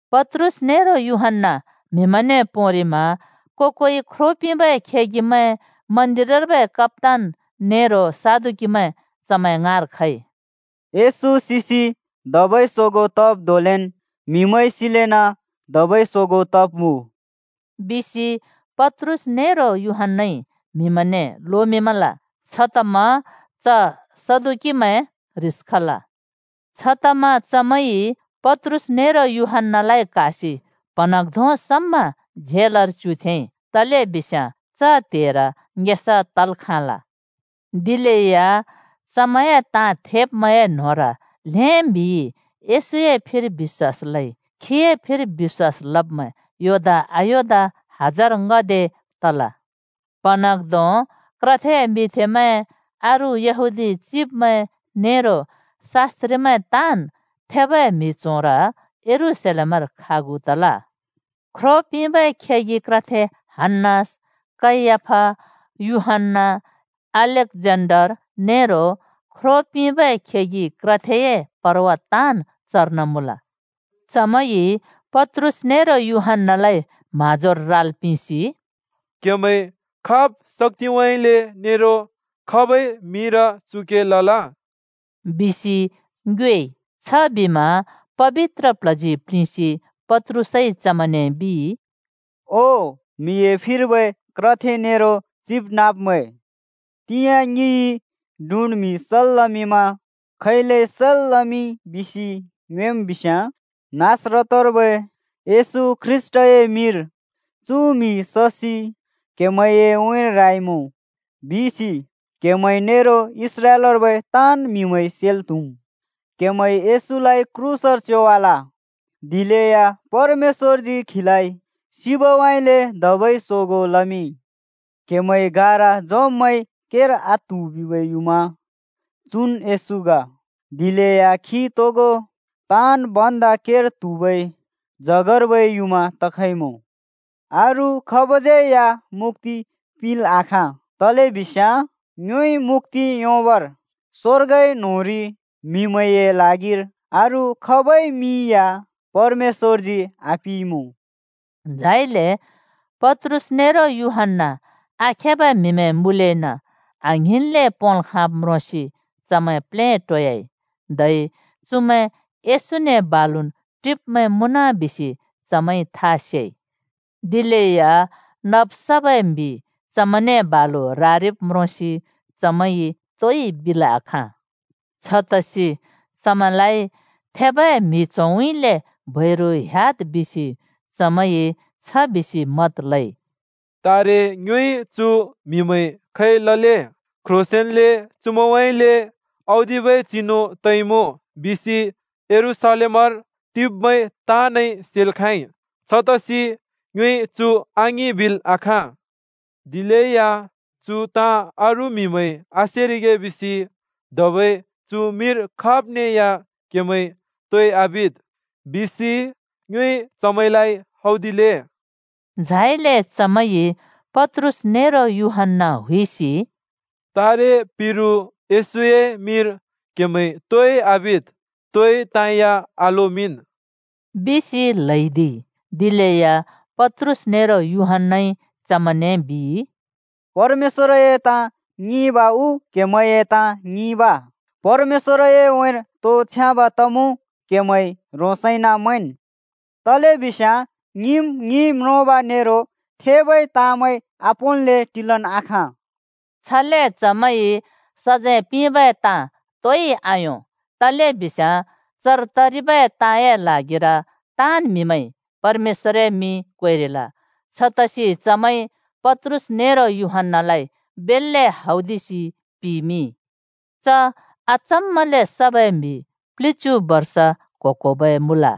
पत्रुस नेरो यूहन्‍ना म्हिमैंने पोंरिमा को-कोइ ख्रो पिंबै खेगिमैं, मन्दिरर्बै कप्‍तान नेरो सदुकीमैं चमैं ङाँर खइ। “येशू सिसि धबै सोगों तब् धोंलेन् म्हिमैं सिलेना धबै सोगों तब्मुँ,” बिसि पत्रुस नेरो यूहन्‍नाइ म्हिमैंने लोमिंमल। छतमा च सदुकीमैं ह्रिस खल। छतमा चमैंइ पत्रुस नेरो यूहन्‍नालाइ क्हासि प्हँन्हाँग्धों समा झेलर च्युथेंइ तलेबिस्याँ च त्हेर ङेसा तल् खाँल। दिलेया चमैंए ताँ थेब्मैंए न्होंर ल्हें म्हिइ येशूए फिर बिश्‍वास लइ। खीए फिर बिश्‍वास लब्मैं योदा-अयोदा हजार ङ्‍हदे तल। प्‍हँन्हाँग्‍धों क्रथे मिंथेमैं, अरू यहूदी चिब्मैं, नेरो शास्‍त्रिमैं ताँन् थेबै म्हि च्होंर यरूशलेमर खागु तल। ख्रो पिंबै खेगि क्रथे हन्‍नास, कैयाफा, यूहन्‍ना, अलेक्जेन्डर नेरो ख्रो पिंबै खेगि क्रथेए परवा ताँन् चर्न मुँल। चमैंइ पत्रुस नेरो यूहन्‍नालाइ म्हाँजोर राल् पिंसि “क्हेमैंइ खाब् शाक्‍तिउँइँले नेरो खाबै मिंर चु के लल?” बिसि ङ्योएइ। छबिमा पबित्र प्ल्हजी प्लिंसि पत्रुसइ चमैंने बिइ, “ओ म्हिए फिर्बै क्रथे नेरो चिबनाँब्मैं! तिंयाँ ङिइ डुँड् म्हि सल् लमिंमा खैले सल् लमिंइ बिसि ङ्योएम् बिस्याँ, नासरतर्बै येशू ख्रीष्‍टए मिंर चु म्हि ससि क्हेमैंए उँइँर राइमुँ बिसि क्हेमै नेरो इस्राएलर्बै ताँन् म्हिमैंइ सेल् त्हुम्। क्हेमैंइ येशूलाइ क्रूसर च्योवाल, दिलेया परमेश्‍वरजी खीलाइ सिबउँइँले धबै सोगों लमिंइ। क्‍हेमैं गारा झोंब्‍मैंइ केर आत्हु बिबै युँमा चुन् येशू ग, दिलेया खी तोगो ताँन् भन्दा केर त्हुबै जगर्बै युँमा तखइमुँ। अरू खाबज्यै मुक्‍ति पिंल् आखाँ तलेबिस्याँ ङ्योइ मुक्‍ति योंबर स्वर्गए न्होंरि म्हिमैंए ल्हागिर अरू खाबै मिं या परमेश्‍वरजी आपिंइँमुँ।” झाइले पत्रुस नेरो यूहन्‍ना आखेबै म्हिमैं मुँलेना आङ्हिंन्ले पोंल् खाँब् म्रोंसि चमैं प्लेटोयाइ। धै चुमैं येशूने बालुन् टिब्मैं मुँन बिसि चमैंइ था सेइ। दिलेया नब् सबै म्हि चमैंने बालु रारिब् म्रोंसि चमैंइ तोइ बिल् आखाँ। छतसि चमैंलाइ थेबै म्हि च्होंउँइँले बैरु ह्‍याद् बिसि चमैंइ छ बिसि मत लइ: “तारे ङ्योइ चु म्‍हिमैं खै लले? क्ह्रोंसेंन्ले चुमैंउँइँले औदिबै चिनु तइमुँ बिसि यरूशलेमर टिब्मैं ताँनइ सेल् खाँइ। छतसि ङ्योइ चु आङिं बिल् आखाँ। दिलेया चु ताँ अरू म्‍हिमैंइ आसेरिगे बिसि ‘धबै चु मिंर खाब्ने या क्हेमैंइ तोइ आबिद्’ बिसि ङ्योइ चमैंने हौदिले।” झाइले चमैंइ पत्रुस नेरो यूहन्‍ना हुइसि “तारे पिरु येशूए मिंर क्हेमैंइ तोइ आबिद्, तोइ ताँ या आलोमिंन्!” बिसि ल्हैदिइ। दिलेया पत्रुस नेरो यूहन्‍नाइ चमैंने बिइ, “परमेश्‍वरए ताँ ङिंब उ क्हेमैंए ताँ ङिंब? परमेश्‍वरए उँइँर तो छ्याँब तमुँ क्हेमैं ह्रोंसैना मैंन्। तलेबिस्याँ ङिम् ङिइ म्रोंब नेरो थेबै ताँमै आपोंल्‍ले टिलन् आखाँ।” छले चमैंइ सजैं पिंबै ताँ तोइ आयों तलेबिस्याँ चर तरिबै ताँए ल्हागिर ताँन् म्हिमैंइ परमेश्‍वरए मिं क्वेरिल। छतसि चमैंइ पत्रुस नेरो यूहन्‍नालाइ बेल्‍ले हौदिसि पिमिंइ। च अचम्माले सबै म्हि प्लिच्यु बर्ष क्हो-क्होबै मुँल।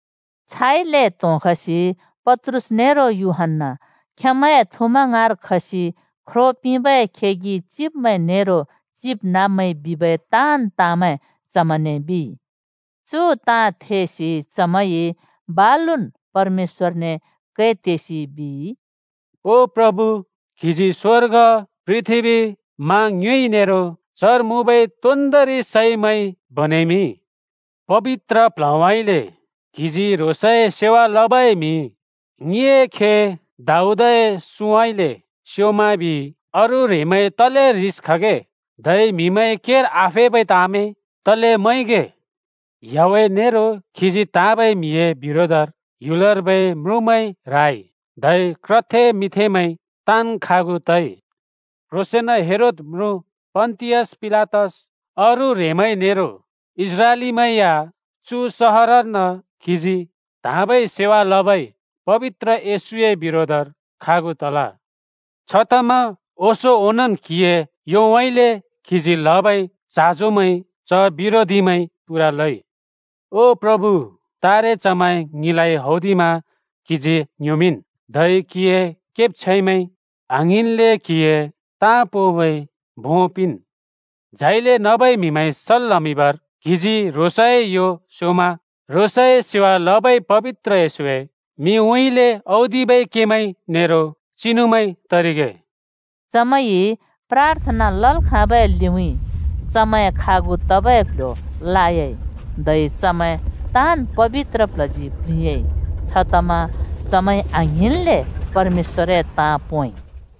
छाइले त्होंखसि पत्रुस नेरो यूहन्‍ना खेंमैए थुमैं ङाँर खसि ख्रो पिंबै खेगि चिब्मैं नेरो चिबनाँब्मैंइ बिबै ताँन् ताँमैं चमैंने बिइ। चु ताँ थेसि चमैंइ बालुन् परमेश्‍वरने कै तेसि बिइ, “ओ प्रभु! क्हिजी स्वर्ग, पृथ्बी, मा ङ्युँइ नेरो चर मुँबै तोन्दोंरि सैमैं बनेमिंइ। पबित्र प्ल्हउँइँले क्हिजी ह्रोंसए सेवा लबै म्हि ङिए खे दाऊदए सुँउँइँले स्योमा बिइ, ‘अरू ह्रेंमैं तले ह्रिस खगे, धै म्हिमैंइ केर आफेबै ताँमैं तले मैंगे? याहवेह नेरो खीजी त्हाँबै म्हिए बिरोधर ह्‍युलर्बै म्रुँमैं राइ, धै क्रथे मिंथेमैं ताँन् खागु तइ।’ क्ह्रोंसेंन हेरोद म्रुँ, पन्तियस पिलातस, अरू ह्रेंमैं नेरो इस्राएलीमैं या चु सहरर्न क्हिजी त्हाँबै सेवा लबै पबित्र येशूए बिरोधर खागु तल। छतमा ओंसों ओंनोंन् क्हिए योउँइँले क्हिजी लबै चाँजोमैं च बिरोधीमैंइ पूरा लइ। ओ प्रभु तारे, चमैंइ ङिलाइ हौदिमा क्हिजी ङ्ह्‍योमिंन्, धै क्हिए केब्छैंमैंइ आङ्हिंन्ले क्हिए ताँ पोंबै भों पिंन्। झाइले नबै म्हिमैं सल् लमिंबर क्हिजी ह्रोंसए यो स्योंमा, ह्रोंसए सेवा लबै पबित्र येशूए मिंउँइँले औदिबै केमैं नेरो चिनुमैं तरिगे।” चमैंइ प्राथना लल् खाँबै लिउँइँ चमैं खागु तबै क्ल्ह्‍यो लायाइ, धै चमैं ताँन् पबित्र प्ल्हजी प्लिंयाँइ, छतमा चमैंइ आङ्हिंन्ले परमेश्‍वरए ताँ पोंइ।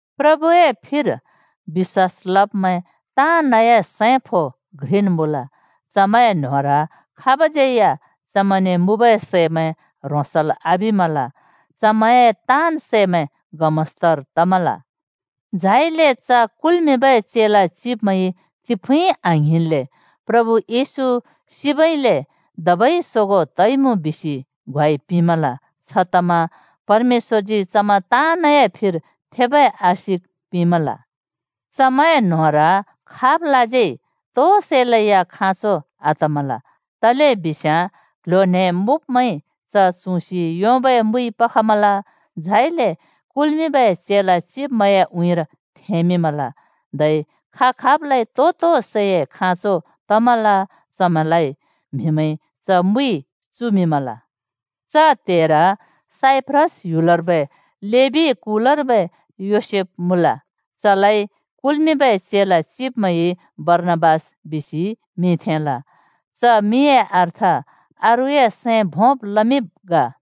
प्रभुए फिर बिश्‍वास लब्मैं ताँनए सैं, खों घ्रिन् मुँल। चमैंए न्होंर खाबज्यै या चमैंने मुँबै सैमैं ह्रोंसल् आबिमल। चमैंए ताँन् सैमैं गमस्तर तमल। झाइले च कुल्मिंबै चेला चिब्मैंइ तिफुँइ आङ्हिंन्ले प्रभु येशू सिबइले धबै सोगों तइमुँ बिसि ग्वाइ पिंमल, छतमा परमेश्‍वरजी चमैं ताँनए फिर थेबै आशिक पिंमल। चमैंए न्‍होंर खाबलाज्यै तो सैलै या खाँचो आतमल, तलेबिस्याँ क्ल्ह्‍यो न्हें मुँब्मैंइ च चुँसि योंबै मुइ पखमल, झाइले कुल्मिंबै चेला चिब्मैंए उँइँर थेंमिंमल। धै खा-खाबलाइ तो-तो सैए खाँचो तमल, चमैंलाइ म्हिमैंइ च मुइ चुमिंमल। च त्हेर साइप्रस ह्‍युलर्बै लेबी कुलार्बै योसेफ मुँल चलाइ कुल्मिंबै चेला चिब्मैंइ बर्णाबास बिसि मिं थेंल। (च मिंए अर्थ अरूए सैं भोंब् लमिंब् ग।)